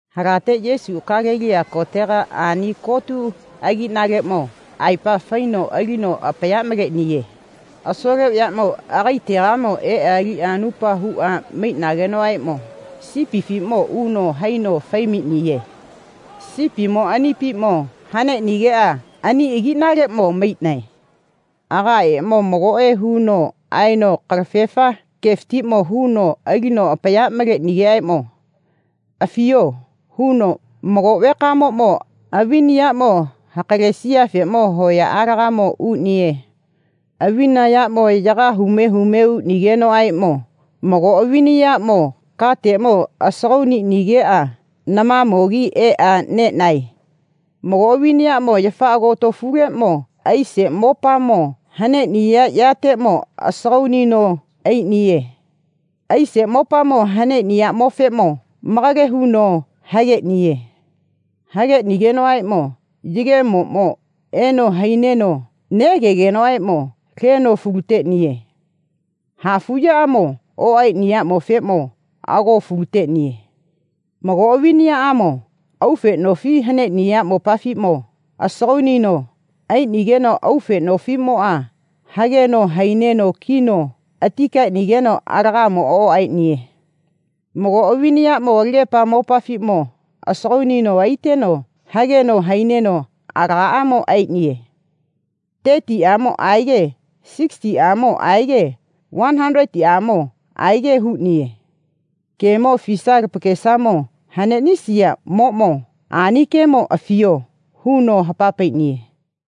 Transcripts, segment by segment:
Halate Yesuʼa Galeliya kotega ani kotu agiʼnaleʼmo aepa faino alino apaya maleʼniye. Asole vayaʼmo agaetegamo eʼa aliʼa anupa huʼa maiʼnagenoʼaeʼmo sipifiʼmo uno haino fai maiʼniye. Sipimo anipiʼmo haneʼnigeʼa ani agiʼnaleʼmo maiʼnae. Agaemo magoʼe huno aeno kalafefa gefatiʼmo huno alino apaya malenoʼaeʼmo, Afiyo, huno, mago vekamoʼmo avina yaʼmo hakalesiyafeʼmo hoyaʼalegamo uʼniye. Avina yaʼmo yaga hume hume uʼnigenoʼaeʼmo mago avina yaʼmo kateʼmo asagauno aiʼnigeʼa namamogi eʼa neʼnae. Mago avina yaʼmo yafa agotofuleʼmo aise mopamo haneʼniya yateʼmo asagauno aiʼniye. Aise mopamo haneʼniyaʼmofeʼmo malage huno hageʼniye. Hageʼnigenoʼaeʼmo yegemoʼmo eno haineno neʼagegenoʼaeʼmo leno falu teʼniye. Hafuʼyamo oʼaeʼniyaʼmofeʼmo ago falu teʼniye. Mago avina yaʼmo aufe nofiʼmo haneʼniya mopafiʼmo asagauno aiʼnigeno aufe nofiʼmoʼa hageno haiʼneno kino ati kaeʼnigeno alagamo oʼaeʼniye. Mago avina yaʼmo alagepa mopafiʼmo asagauno aiteno hageno haineno alagamo aeʼniye. Tetiʼamo aege sigisitiʼamo aege vani hataletiʼamo aege huʼniye. Gemo afisaya lapakesamo haneʼnisiyaʼmoʼmo ani gemo afiyo, huno hapa paiʼniye.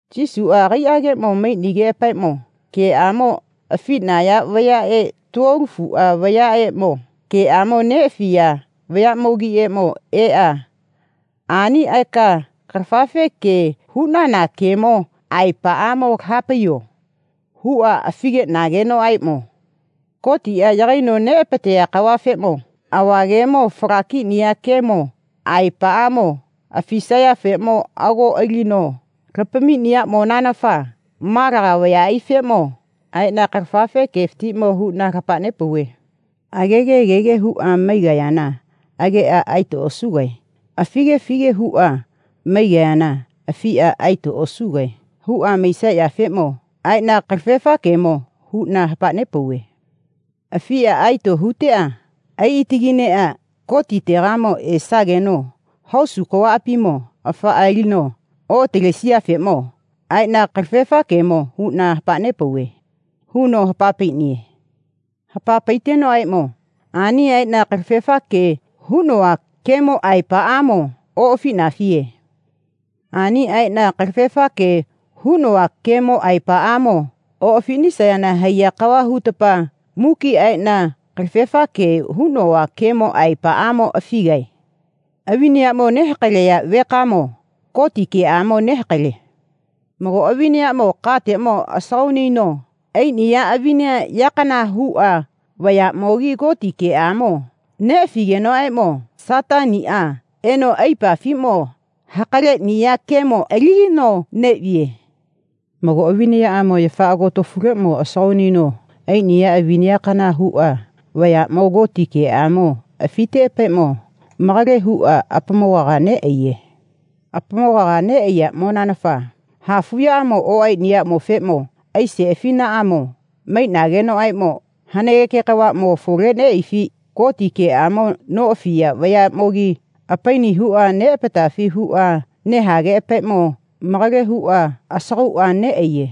Yesuʼa agaiʼageʼmo maiʼnigeʼapaeʼmo geʼamo afiʼnaya vayaʼe tuolofuʼa vayaʼmo geʼamo neʼafiya vayaʼmogiʼeʼmo eʼa, ani aeka kalafefa ge huʼnana gemo aepaʼamo laha paiyo, huʼa afi geʼnagenoʼaeʼmo Gotiʼa yagaino apateʼniya kavafeʼmo ava gemo fala kiʼniya gemo aepaʼamo afisayafeʼmo ago alino lapamiʼniyaʼmonanafa malaga vayaʼaifeʼmo aeʼna kalafefa gefatiʼmo huʼna hapa nepauve. Agege agege huʼa maigayana ageʼa aeto osuge afige afige huʼa maigayana afiʼa aeto osuge huʼa maisayafeʼmo aeʼna kalafefa gemo huʼna hapa nepauve. Afiʼa aeto huteʼa aiʼa atagineʼa Gotitegamo esageno hosu kavaʼapimo afaʼa alino oʼatalesiyafeʼmo aeʼna kalafefa gemo huʼna hapa nepauve, huno hapa paiʼniye. Hapa paitenoʼaeʼmo, ani aeʼna kalafefa ge huʼnova gemo aepaʼamo oʼafiʼnafiye. Ani aeʼna kalafefa ge huʼnova gemo aepaʼamo oʼafiʼnisayana haiya kava hutapa muki aeʼna kalafefa gemo huʼnova gemo aepaʼamo afigae. Avina yaʼmo nehakaleya vekamoʼmo Goti geʼamo nehakale. Mago avina yaʼmo kateʼmo asagauno aiʼniya avina yakana huʼa vayaʼmogi Goti geʼamo neʼafigenoʼaeʼmo Sataniʼa eno apaipafiʼmo hakaleʼniya gemo alinino neʼviye. Mago avina yaʼmo yafa agotofuleʼmo asagauno aiʼniya avina yakana huʼa vayaʼmogi Goti geʼamo afiteʼapaeʼmo malage huʼa apamogaga neʼaiye. Apamogaga neʼaiyaʼmonanafa hafuʼya oʼaeʼniyaʼmofeʼmo aise afinaʼmo maiʼnagenoʼaeʼmo hanageke kavaʼmo afole neʼaifi Goti geʼamo noʼafiya vayaʼmogi apaini huʼa neʼapatafi huʼa nehageʼapaeʼmo malage huʼa asagauʼa neʼaiye.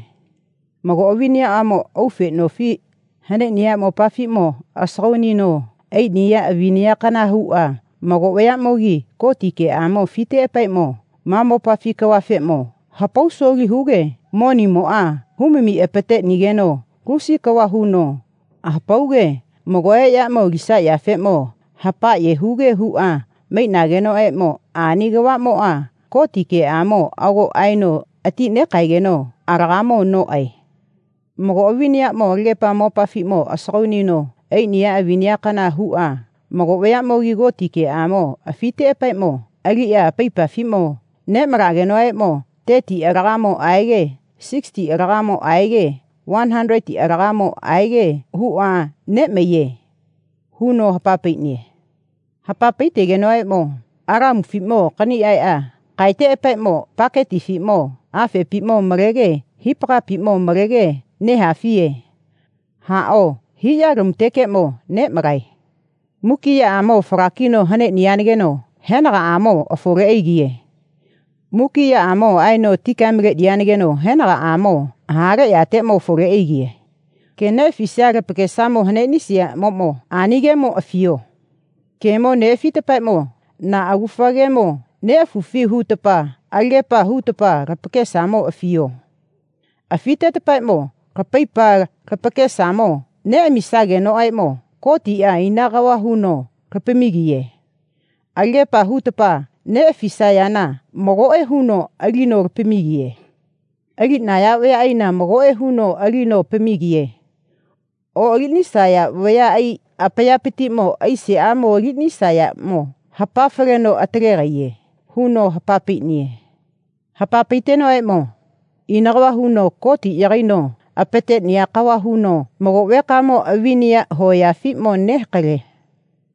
Mago avina yaʼmo aufe nofi haneʼniya mopafiʼmo asagauno aiʼniya avina yakana huʼa mago vayaʼmogi Goti geʼamo afiteʼapaeʼmo ma mopafi kavafeʼmo hapausoli huge monimoʼa humi apateʼnigeno lusi kava huno hapauge magoʼe yaʼmo alisayafeʼmo hapaʼye huge huʼa maiʼnagenoʼaeʼmo ani kavaʼmoʼa Goti geʼamo ago aeno ati nekaegeno alagamo noʼae. Mago avina yaʼmo alagepa mopafiʼmo asagauno aiʼniya avina yakana huʼa mago vayaʼmogi Goti geʼamo afiteʼapaeʼmo aliʼa apaipafiʼmo neʼmalagenoʼaeʼmo tetiʼa alagamo aege sigisitiʼa alagamo aege vani hataletiʼa alagamo aege huʼa neʼmaiye, huno hapa paiʼniye. Hapa paitenoʼaeʼmo, lamufiʼmo kani aeʼa kaeteʼapaeʼmo paketimo afepiʼmo malege hipagapiʼmo malege nehafiye. Haʼao hiʼyalamutekeʼmo neʼmalae. Muki yaʼamo fala kino haneʼniyanageno henagaʼamo afole aigiye. Muki yaʼamo aino ati kae maleʼniyanageno henagaʼamo ha le yategamo afole aigiye. Ge neʼafisaya lapakesamo haneʼnisiyaʼmoʼmo ani gemo afiyo. Gemo neʼafitapaeʼmo, na agufa gemo neʼafufi hutapa alagepa hutapa lapakesamo afiyo. Afitetapaeʼmo lapaipa lapakesamo neʼamisagenoʼaeʼmo Gotiʼa ina kava huno lapamigiye. Alagepa hutapa neʼafisayana magoʼe huno alino lapamigiye. Aliʼnaya vayaʼaina magoʼe huno alino apamigiye. Oʼaliʼnisaya vayaʼai apayapatiʼmo aiseʼamo aliʼnisaya yaʼmo hapafaleno atalegaiye, huno hapa paiʼniye. Hapa paitenoʼaeʼmo, Ina kava huno Gotiʼa yagaino apateʼniya kava huno mago vekamoʼmo avina yaʼmo hoyafiʼmo nehakale.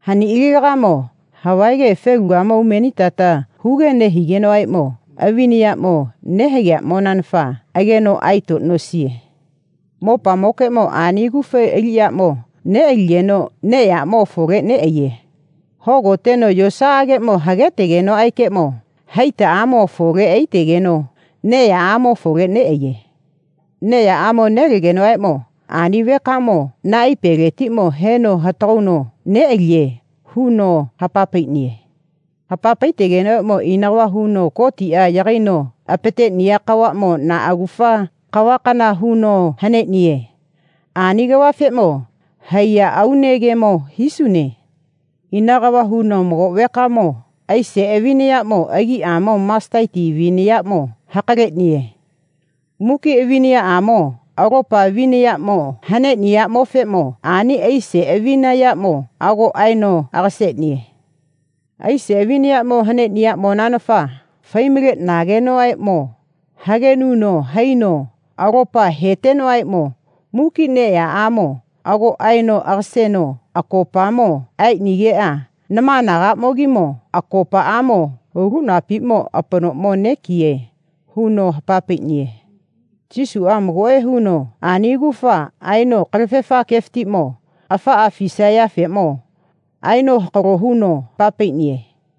Haniʼilagamo havaege felugamo umenitata huge nehigenoʼaeʼmo avina yaʼmo nehageyaʼmonanafa ageno aeto nosiye. Mopamokeʼmo ani agufa aliʼyaʼmo neʼaligeno neʼyaʼmo afole neʼaiye. Hogoteno yosaʼageʼmo hagetenoʼaekeʼmo haitaʼamo afole aitegeno neʼyaʼamo afole neʼaiye. Neʼyaʼamo nelegenoʼaeʼmo ani vekamoʼmo naipeletiʼmo heno hatagauno neʼaliye, huno hapa paiʼniye. Hapa paitenoʼaeʼmo, ina kava huno Gotiʼa yagaino apateʼniya kavaʼmo na agufa kavakana huno haneʼniye. Ani kavafeʼmo haiya aune gemo hisune. Ina kava huno mago vekamoʼmo aise avina yaʼmo agiʼamo masiteti avina yaʼmo hakaleʼniye. Muki avina yaʼamo alopa avina yaʼmo haneʼniyaʼmofeʼmo ani aise avina yaʼmo ago aeno aga seʼniye. Aise avina yaʼmo haneʼniyaʼmonanafa fai maleʼnigenoʼaeʼmo hagenuno haino alopa hetenoʼaeʼmo muki neʼyaʼamo ago aeno aga seno akopamo aeʼnigeʼa nama anagaʼmogimo akopaʼamo ulinapiʼmo apanoʼmo nekiye, huno hapa paiʼniye. Yesuʼa magoʼe huno ani agufa aeno kalafefa gefatiʼmo afaʼa afisayafeʼmo aeno hakalo huno hapa paiʼniye.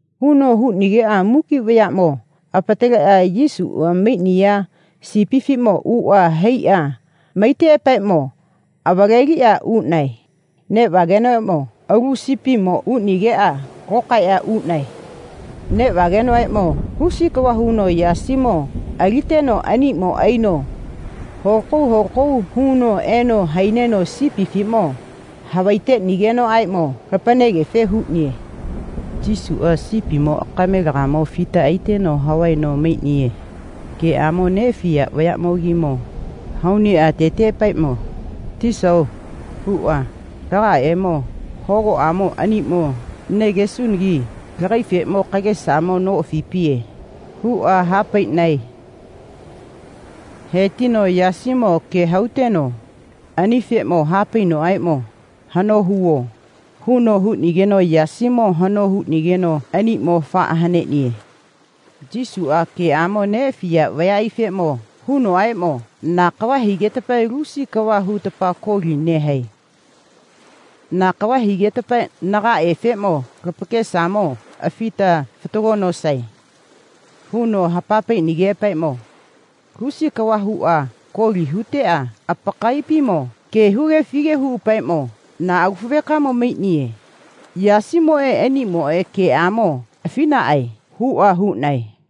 Huno huʼnigeʼa muki vayaʼamo apataleʼa Yesuʼa maiʼniya sipifiʼmo uʼa haiʼa maiteʼapa avaleliʼa uʼnae. Neʼvagenoʼaeʼmo mago alu sipimo uʼnigeʼa lokaeliʼa uʼnae. Neʼvagenoʼaeʼmo lusi kava huno yasimo aliteno aniʼmo aino holakau holakau huno eno haineno sipifiʼmo havaiteʼnigeno aeno lapanegefe huʼniye. Yesuʼa sipimo akamelegamo afita aiteno havaeno maiʼniye. Geʼamo neʼafiya vayaʼmogi hauneʼa ateteʼapaeʼmo, tisao, huʼa, lagaemo hogoʼamo aniʼmo negesunagi lagaefeʼmo kagesa noʼafipiye, huʼa ha paiʼnae. He tino yasieʼmo ge hauteno anifeʼmo ha painoʼaeʼmo, hano huvo, huno huʼnigeno yasimo hano huʼnigeno aniʼmo afaʼa haneʼniye. Yesuʼa geʼamo neʼafiya vayaʼaifeʼmo hunoʼaeʼmo, na kava higetapa lusi kava huta koli nehae. Na kava higetapa nagaefeʼmo lapakesamo afita fatago nosae, huno hapa paiʼnigeʼapaeʼmo lusi kava huʼa koli huteʼa apakaiʼapimo ge huge afige huʼapaeʼmo, na agufa vekamo maiʼniye. Yasimoʼe aniʼmoʼeʼmo geʼamo afiʼnaʼae, huʼa huʼnae.